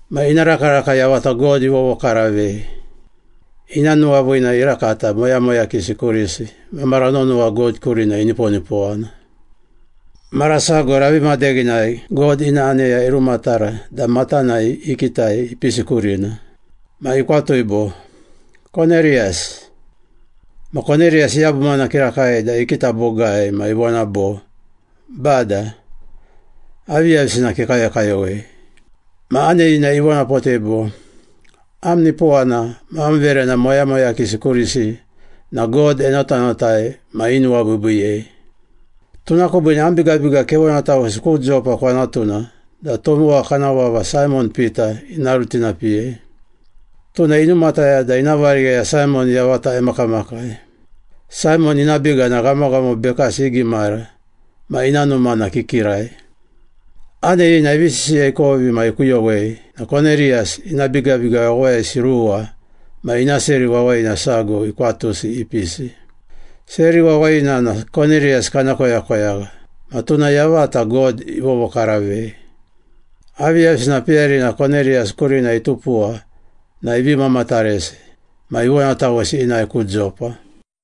Ma ina rakaraka yavata God ivovokaravei. Ina nuwaviina irakata moyamoyakisi kurisi ma mara nonowa God kurina iniponipowana. Mara sago ravi madeghinai God ina aneya irumatara da matanai ikitai ipisi kurina. Ma ikwatui bo, “Koneriyas.” Ma Koneriyas iyabumana kirakai da ikita bogai ma ivona bo, “Bada, aviyavisina kekayokayowei?” Ma aneyina ivonapotei bo, “Am nipowana ma am verena moyamoyakisi kurisi na God enotanotai ma inuwabiibiiyei. Tuna kubiine am bigabiga kevonatawesi ku Jopa kwanatuna da tomowa kana vava Saimon Pita ina rutinapiyei. Tuna inumataya da ina varigheya Saimon yavata emakamakai. Saimon ina biga na ghamoghamo bekasi igimara ma ina numa na kikirai.” Aneyina ivi sisiya ikovi ma ikuyowei na Koneriyas ina bigabiga wawayisi ruwa ma ina seri wawayina sago ikwatusi ipisi. Seri wawayina na Koneriyas kana koyakoyagha ma tuna yavata God ivovokaravei. Aviyavisina peyarina Koneriyas kurina itupuwa na ivi mamataresi. Ma ivonatawesi inae ku Jopa.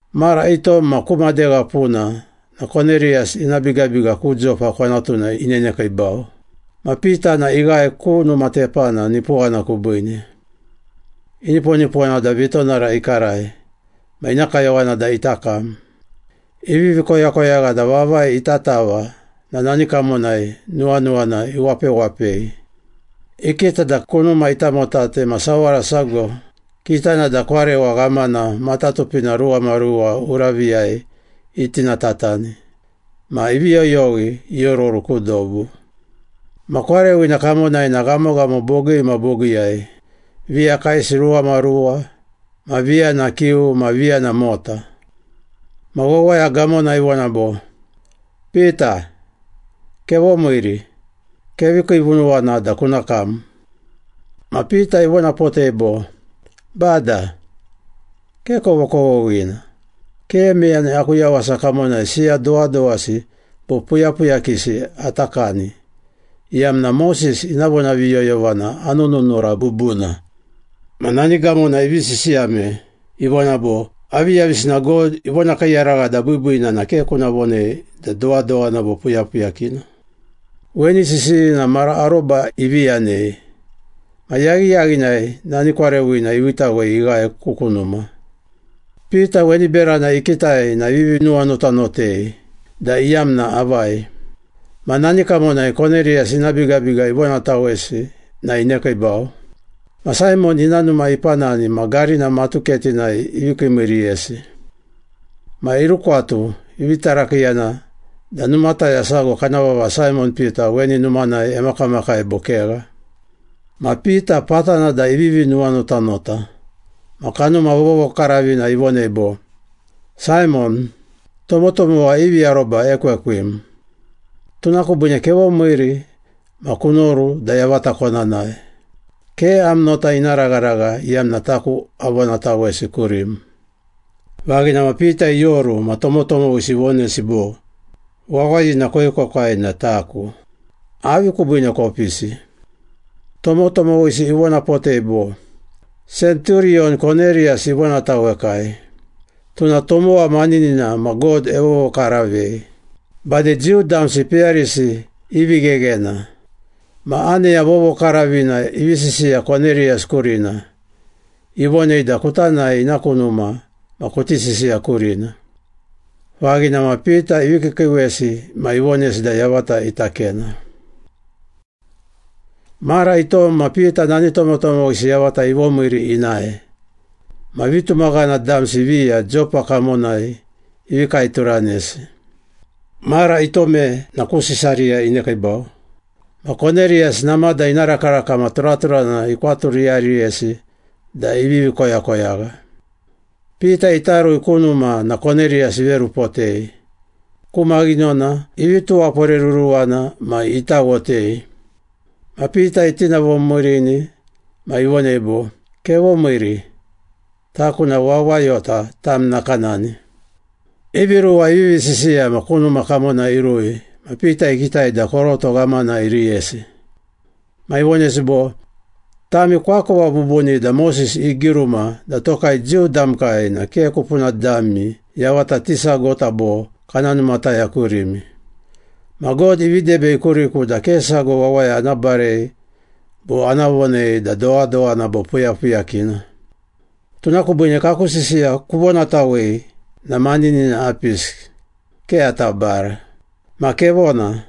Mara itom ma ku madegha puna na Koneriyas ina bigabiga ku Jopa kwanatuna inenekiibau. Ma Pita na ighae ku numa tepana nipowana kubiine. Iniponipowana da vitonara ikarai, ma ina kayowana da ita kam. Ivivi koyakoyagha da vavai ita tava na nani kamonai nuwanuwana iwapewapei. Ikita da kunuma itamotate ma sawara sago, kitana da kwarewa ghamana matatupina ruwamaruwa uraviyai itinatatani ma ivi yoyowi iororu ku dobu. Ma kwarewina kamonai na ghamoghamo bogii ma bogiiyai, viya kaesi ruwamaruwa ma viya na kiu ma viya na mota. Ma wawaya gamona ivona bo, “Pita, kevomiiri. Kevi kiivunuwana da kuna kam.” Ma Pita ivonapotei bo, “Bada, ke kovokovoghina! Ke meyani aku yawasa kamonai siya dowadowasi bo puyapuyakisi ata kani, iyamna Moses ina vonaviyoyovana anununura bubuna.” Ma nani gamona ivi sisiyame, ivona bo, “Aviyavisina God ivonakiiyaragha da biibiina na ke kuna vonei da dowadowana bo puyapuyakina.” Weni sisiyina mara aroba ivi yanei, ma yaghiyaghinai nani kwarewina iviitawei ighae ku kunuma. Pita weni berana ikitai na ivivi nuwanotanotei da iyamna avai. Ma nani kamonai Koneriyas ina bigabiga ivonatawesi na inekiibau. Ma Saimon ina numa ipanani ma garina matuketinai ivi kiimiiriyesi. Ma irukwatu, ivi tarakiiyana da numataya sago kana vava Saimon Pita weni numanai emakamakai bo kegha. Ma Pita patana da ivivi nuwanotanota ma Kanuma Vovokaravina ivonei bo, “Saimon, tomotomowa ivi aroba ekwekwim, tuna kubiine kevomiiri ma kunoru da yavata kona nae. Ke am nota ina ragharagha iyamna taku avonatawesi kurim.” Vaghina ma Pita ioru ma tomotomowisi ivonesi bo, “Wawayina koekwekwai na taku. Avi kubiine kopisi?” Tomotomowisi ivonapotei bo, “Senturiyon Koneriyas ivonatawekai. Tuna tomowa maninina ma God evovokaravei. Bade Jiu damsi peyarisi i vigheghena. Ma aneya vovokaravina ivi sisiya Koneriyas kurina, ivonei da kuta nae ina ku numa ma kuti sisiya kurina.” Vaghina ma Pita ivi kiikiiwesi ma ivonesi da yavata ita kena. Mara itom na Pita nani tomotomowisi yavata ivomiiri inae, ma vitumaghana damsi viya Jopa kamonai ivi kaeturanesi. Mara itome na ku Sisariya inekiibau. Ma Koneriyas namada ina rakaraka ma turaturana ikwaturiyariyesi da ivivi koyakoyagha. Pita ita rui ku numa na Koneriyas iverupotei, ku maghinona ivi tuwaporeruruwana ma itawotei. Ma Pita itinavomiirini ma ivonei bo, “Kevomiiri, taku na wawayota tam nakanani.” Ivi ruwa ivivi sisiya ma ku numa kamona irui ma Pita ikitai da koroto ghamana iriyesi. Ma ivonesi bo, “Tami koakova bubuni da Moses igiruma da tokai Jiu damkai na ke kupuna dami yavata tisagota bo kana numataya kurimi. Ma God ivi debei kuriku da ke sago wawaya ana barei bo ana vonei da dowadowana bo puyapuyakina. Tuna kubiine, kaku sisiya kuvonatawei na maninina apisi, ke ata bara. Ma, kevona.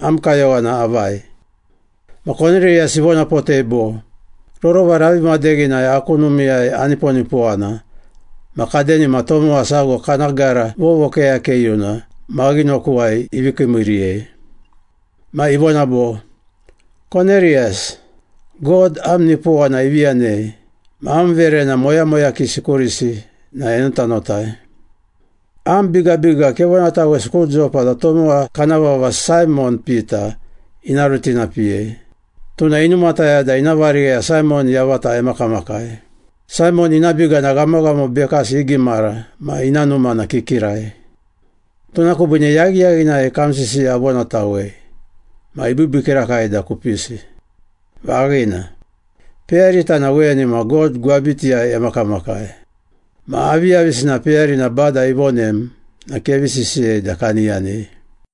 Am kayowana avai?” Ma Koneriyas ivonapotei bo, “Rorova ravi madeghinai aku numiiyai aniponipowana ma kadenima tomowa sago kana gara vovokeyakeyuna maghinokuwai ivi kiimiiriyei. Ma ivona bo, ‘Koneriyas, God am nipowana ivi yanei ma am verena moyamoyakisi kurisi na enotanotai. Am bigabiga kevonatawesi ku Jopa da tomowa kana vava Saimon Pita ina rutinapiyei. Tuna inumataya da ina varigheya Saimon yavata emakamakai. Saimon ina biga na ghamoghamo bekasi igimara ma ina numa na kikirai.’ Tuna kubiine yaghiyaghinai kam sisiya avonatawei, ma ibiibii kirakai da kupisi. Vaghina. Peyarita na weni ma God gwabitiyai emakamakai. Ma aviyavisina peyarina Bada ivonem na kevi sisiyei da kani yanei.”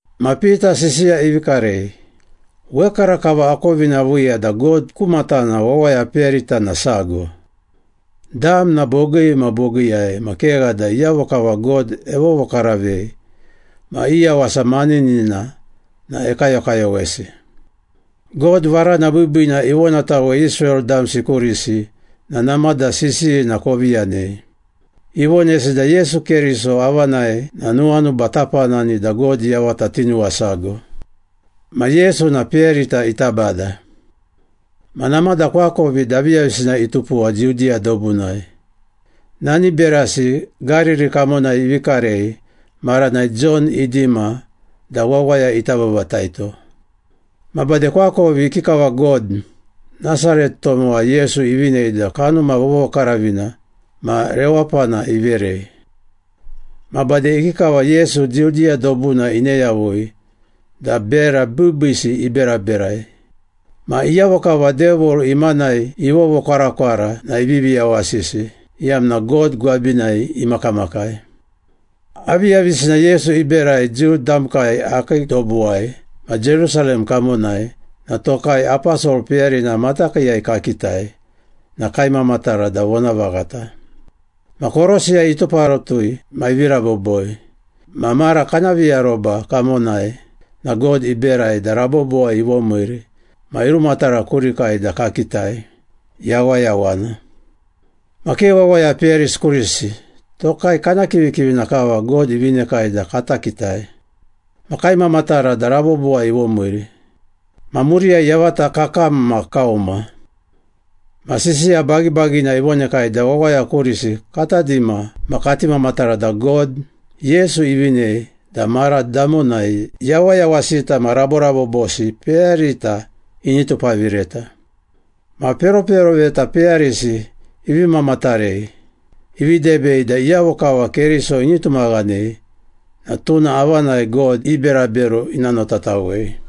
Ma Pita sisiya ivi karei, “Wekarakava akovina aviiya da God ku matana wawaya peyarita na sago. Dam na bogii ma bogiiyai ma kegha da iyavo kava God evovokaravei ma i yawasa maninina na ekayokayowesi. God varana biibiina ivonatawei Israel damsi kurisi na namada sisiyina kovi yanei. Ivonesi da Yesu Keriso avanai na nuwanuba tapanani da God yavata tinuwasago. Ma Yesu na peyarita ita Bada. Ma namada koakovi da aviyavisina itupuwa Judiya dobunai, nani berasi Gariri kamonai ivi karei maranai Jon idima da wawaya ita babataito. Ma bade koakovi ikikava God, Nasaret tomowa Yesu ivinei da Kanuma Vovokaravina ma rewapana iverei. Ma bade ikikava Yesu Judiya dobuna ine yavui da bera biibiisi iberaberai. Ma iyavo kava Devil imanai ivovokwarakwara na ivivi yawasisi, iyamna God gwabinai imakamakai. Aviyavisina Yesu iberai Jiu damkai akii dobuwai ma Jerusalem kamonai na tokai aposol peyarina matakiiyai kakitai na kaimamatara da vonavaghata. Ma korosiyai ituparatui ma ivi raboboi, ma mara kana viaroba kamonai na God iberai da rabobowai ivomiiri ma irumatara kurikai da kakitai, yawayawana. Ma ke wawaya peyarisi kurisi, tokai kana kivikivina kava God ivinekai da kata kitai. Ma kaimamatara da rabobowai ivomiiri. Ma muriyai yavata kakam ma kauma. Ma sisiya bagibagina ivonekai da wawaya kurisi kata dima ma kati mamatara da God, Yesu ivinei da mara damonai yawayawasita ma raborabobosi peyarita ini tupavireta. Ma peroperoveta peyarisi ivi mamatarei, ivi debei da iyavo kava Keriso ini tumaghanei na tuna avanai God i berabero ina notatawei.”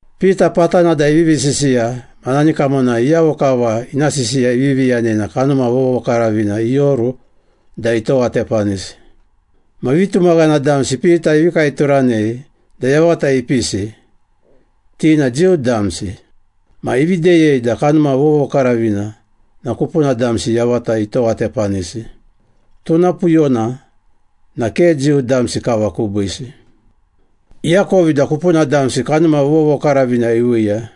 Pita patana da ivivi sisiya ma nani kamonai iyavo kava ina sisiya ivivi yanei na Kanuma Vovokaravina ioru da itowatepanisi. Ma vitumaghana damsi Pita ivi kaeturanei da yavata ipisi, ti na Jiu damsi. Ma ivi deyei da Kanuma Vovokaravina na kupuna damsi yavata itowatepanisi, tuna puyona na ke Jiu damsi kava kubiisi. Iakovi da kupuna damsi Kanuma Vovokaravina iviiya,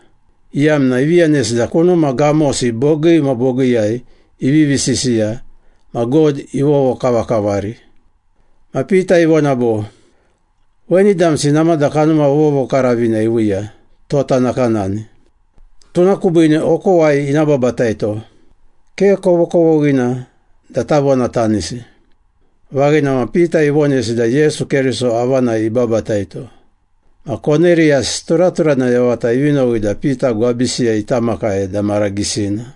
iyamna ivi yanesi da kunuma gamosi bogii ma bogiiyai ivivi sisiya ma God ivovokavakavari. Ma Pita ivona bo, “Weni damsi namada Kanuma Vovokaravina iviiya, tota nakanani. Tuna kubiine okowai ina babataito, ke kovokovoghina da tavonatanisi.” Vaghina ma Pita ivonesi da Yesu Keriso avanai ibabataito. Ma Koneriyas turaturana yavata ivi nowi da Pita gwabisiyai ita makai da mara gisina.